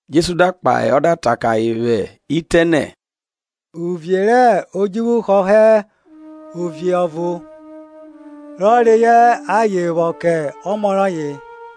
Jesu da kpahe ọ da ta kẹ ayen vwẹ itẹ nẹ, Uvie rẹ odjuvwu họhọ ovie ọvo, rọ reyọ aye vwo kẹ ọmọ rọye.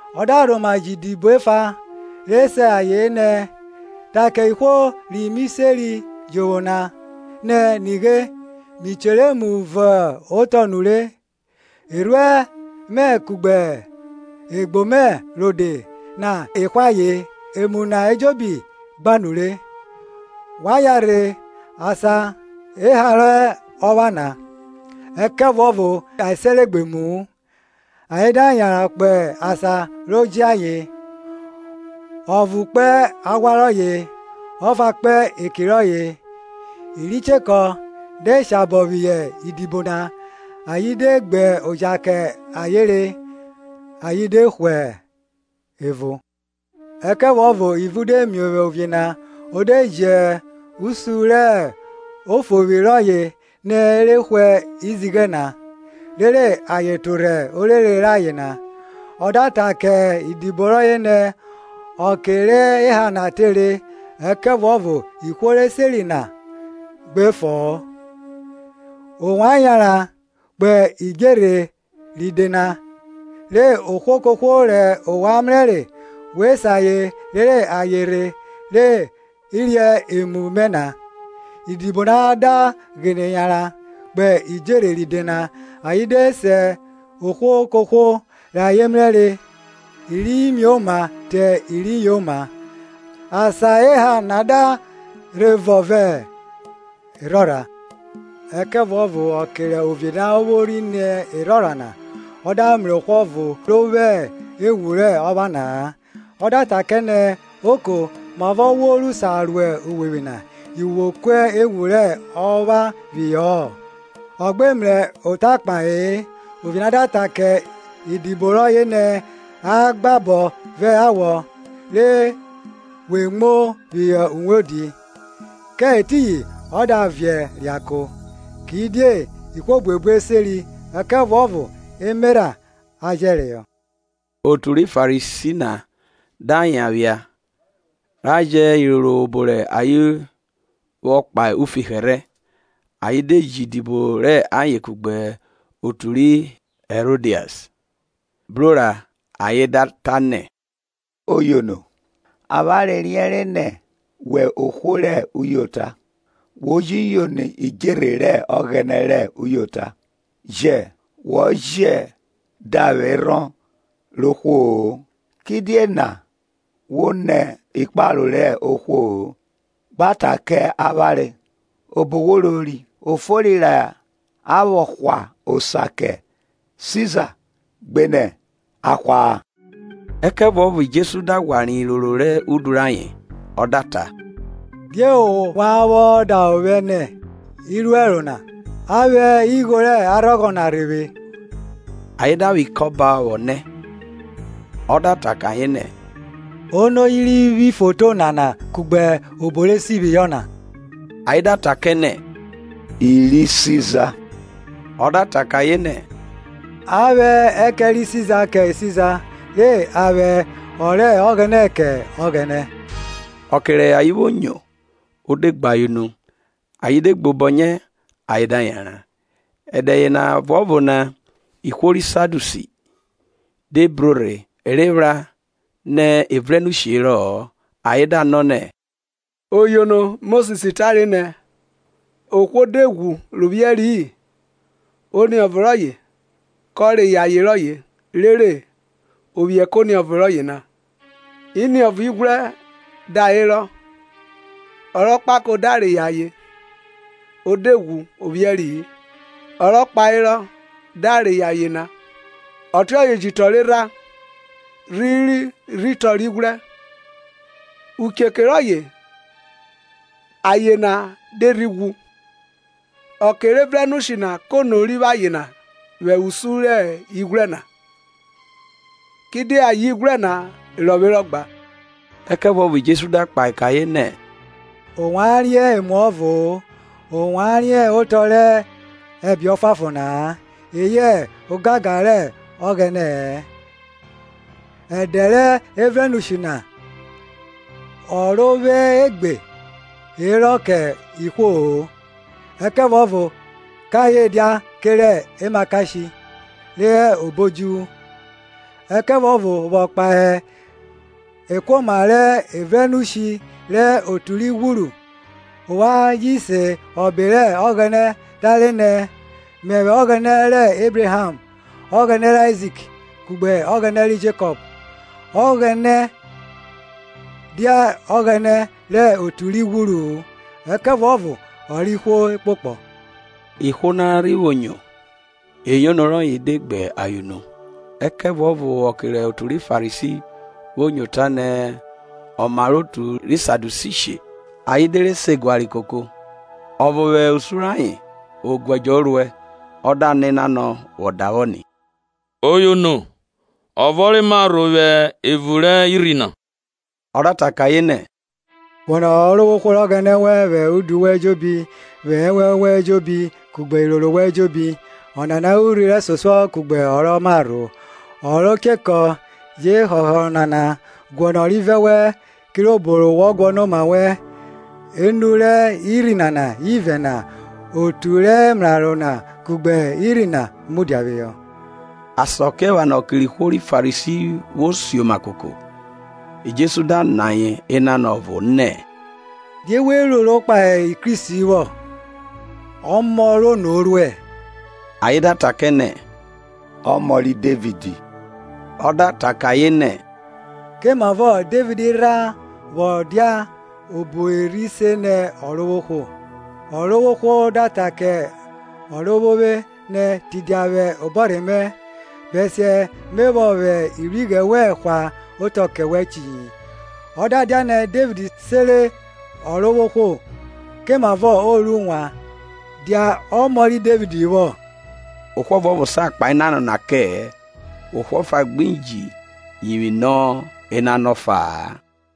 Ọ da rhoma ji idibo efa re se ayen nẹ, Ta ke ihwo ri mi seri jovwo na nẹ, Nighe, Mi chere emu vọn otọ nure; erhuẹn mẹ kugbe egbo mẹ rode na e hwe ayen, emu na ejobi gba nure; Wa yanrhe asan ra da cha rẹ orẹ rẹ opha na. Ẹkẹvuọvo ayen sere gbe emu-u, ayen da yanran kpo asan ro je ayen, ọvo kpo aghwa rọye, ọfa kpo eki rọye. I ri chekọ de shabọ phihọ idibo na, ayen de gbe oja kẹ ayen re, ayen de hwe evo. Ẹkẹvuọvo ivun de miovwi ovie na; o de ji usun rẹ ofovwi rọye nẹ i re hwe izighẹ na, rere ayen torhẹ orere rayen na. Ọ da ta kẹ idibo rọye nẹ, ọke rẹ orẹ rẹ orọvwe na tere, ẹkẹvuọvo ihwo re seri na gbi fo-o. Ovwan yanran kpo idjerhe ride na, re ohwo kohwo rẹ ovwan mrẹre, we se ayen rere ayen rhe re emu mẹ na. Idibo na da ghene yanran kpo idjerhe ride na, ayen de se ohwo kohwo rẹ ayen mrẹre, i ri mioma te i ri yoma; asan orẹ na da rhe vọn vẹ erhorha. Ẹkẹvuọvo ọke rẹ ovie na vwo rhi ni erhorha na, ọ da mrẹ ohwo ọvo ro vwo ewun rẹ ọpha na-a. Ọ da ta kẹ nẹ, Oko, mavọ wo ru sa ro uwevwi na, yi wo ku ewun rẹ ọpha phihọ-ọ? Ọ gbe mrẹ ota kpahe-e. Ovie na da ta kẹ idibo rọye nẹ, A gba abo vẹ awọ re we muo phihọ uwodi; kẹ etiyin ọ da viẹ reako. Kidie ihwo buebu e seri, ẹkẹvuọvo emerha a jẹreyọ. Otu ri Farisi na da yan phia, ra jẹ iroro rẹ obo rẹ ayen vwọ kpahe ufi hẹrhẹ. Ayen de ji idibo rẹ ayen kugbe otu ri Hẹrodias bro ra ayen da ta nẹ, Oyono, avwanre riẹnre nẹ wẹ ohwo rẹ uyota, wo ji yono idjerhe rẹ Ọghẹnẹ rẹ uyota, ye wọ je davwerhọn rẹ ohwo-o. Kidie wo nẹ ikparo rẹ ohwo-o. Gba ta kẹ avwanre, obo wo rori. O fori ra vwo hwa osa kẹ Siza gbenẹ a hwa-a? Ẹkẹvuọvo Jesu da ghwa riẹn iroro rẹ udu rayen, ọ da ta, Die ovwan vwọ davwẹ ovwẹ nẹ, iruero na? A vwẹ igho rẹ arhọghọ na rhe vwe. Ayen da vwẹ ikọba vwọ nẹ. Ọ da ta kẹ ayen nẹ, Ono ri vwo ifoto nana kugbe obo re si phihọ na? Ayen da ta kẹ nẹ, I ri Siza. Ọ da ta kẹ ayen nẹ, A vwẹ ẹkẹn ri Siza kẹ Siza; re a vwẹ ọ rẹ Ọghẹnẹ kẹ Ọghẹnẹ. Ọke rẹ ayen vwo nyo, o de gbe ayen unu, ayen de gbobọnyẹ, ayen da yanran. Ẹdẹ yena ọvuọvo na, ihwo ri Sadiusi de bro rhe, e re phra nẹ evrenushi herọ-ọ; ayen da nọ nẹ, Oyono, Mosis tare nẹ, Ohwo de ghwu ro vwiẹri-i, oniọvo rọye ko reyọ aye rọye, rere o vwiẹ kẹ oniọvo rọye na. Iniọvo ighwrẹ da herọ; Ọ rẹ okpako da reyọ aye o de ghwu ọ vwieri-i, ọ rọ kpaherọ da reyọ aye na. Ọtiọye ji te ọrerha, rhiri rhi te ọrighwrẹ. Ukuko rọye aye na de rhi ghwu. Ọke rẹ evrẹnushi na kono ri vwo ayen na vwẹ usun rẹ iniọvo ighwrẹ na? Kidie ayen ighwrẹ na rọvwerọ gba. Ẹkẹvuọvo Jesu da kpahe kẹ ayen nẹ, Ovwan riẹn emuọvo-o, ovwan riẹn otọ rẹ ẹbe ọfuanfon na-a, eyẹ ogangan rẹ Ọghẹnẹ-ẹ. Ẹdẹ rẹ evrẹnushi na orọvwe gbe herọ kẹ ihwo-o, ẹkẹvuọvo kẹ ayen dia kerẹ emakashe re hẹ obo odjuvwu. Ẹkẹvuọvo vwọ kpahe ekuoma rẹ evrẹnushi rẹ otu ri ghwuru, ovwan ji se obo rẹ Ọghẹnẹ tare nẹ, Mẹvwẹ Ọghẹnẹ rẹ Ebraham, Ọghẹnẹ rẹ Aizik, kugbe Ọghẹnẹ ri Jekọp. Ọghẹnẹ dia Ọghẹnẹ rẹ otu ri ghwuru-u, ẹkẹvuọvo ọ rẹ ihwo ekpokpọ. Rẹ ihwo na vwo nyo eyono rọyẹ na, o de gbe ayen unu. Ẹkẹvuọvo ọke rẹ otu ri Farisi vwo nyo ta nẹ ọ mare otu ri Sadiusi she, ayen de re se ẹguare koko. Ọvo vwẹ usun rẹ ayen, oguẹdjọ o ruẹ, ọ da nọ enanọ vwọ davwọ ni, Oyono, ọvọ re ma rho vwẹ evun rẹ irhi na? Ọ da ta kẹ nẹ, Guọnọ Ọrovwohwo Ọghẹnẹ wẹn vwẹ udu wẹn ejobi, vwẹ ẹnwẹn wẹn ejobi, kugbe iroro wẹn ejobi. Ọnana hẹ urhi rẹsosuọ kugbe ọ rọ marho. Ọ ro chekọ je họhọ ọnana, Gnọnọ ọrivẹ wẹn kirobo wọ guọnọ oma wẹn. Enu rẹ irhi nana ivẹ na, otu rẹ emraro na kugbe irhi na mudia phihọ. Asakiephana ọke rẹ ihwo ri Farisi vwo sioma koko, Jesu da nọ ayen enanọ ọvo nẹ, Die we roro kpahe Kristi vwo? Ọmọ rẹ ono o ruẹ? Ayen da ta kẹ nẹ, Ọmọ ri Devid. Ọ da ta kẹ ayen nẹ, Komavọ Devid rha vwọ dia obo Erhi se nẹ Ọrovwohwo. Ọrovwohwo ta kẹ Ọrovwovwe nẹ, Tidia vwẹ obọrhe mẹ, Bẹsiẹ me vwọ vwẹ ivwighrẹ wẹn hwa otọ kẹ wẹ chiyi. Ọ da dianẹ Devid sere Ọrovwohwo, komavọ o ru wan dia ọmọ ri Devid vwo? Ohwo ọvuọvo sa kpahe enanọ na kẹ-ẹ eyẹ ohwo ọfa gbi ji yivwi nọ enanọ ọfa-a.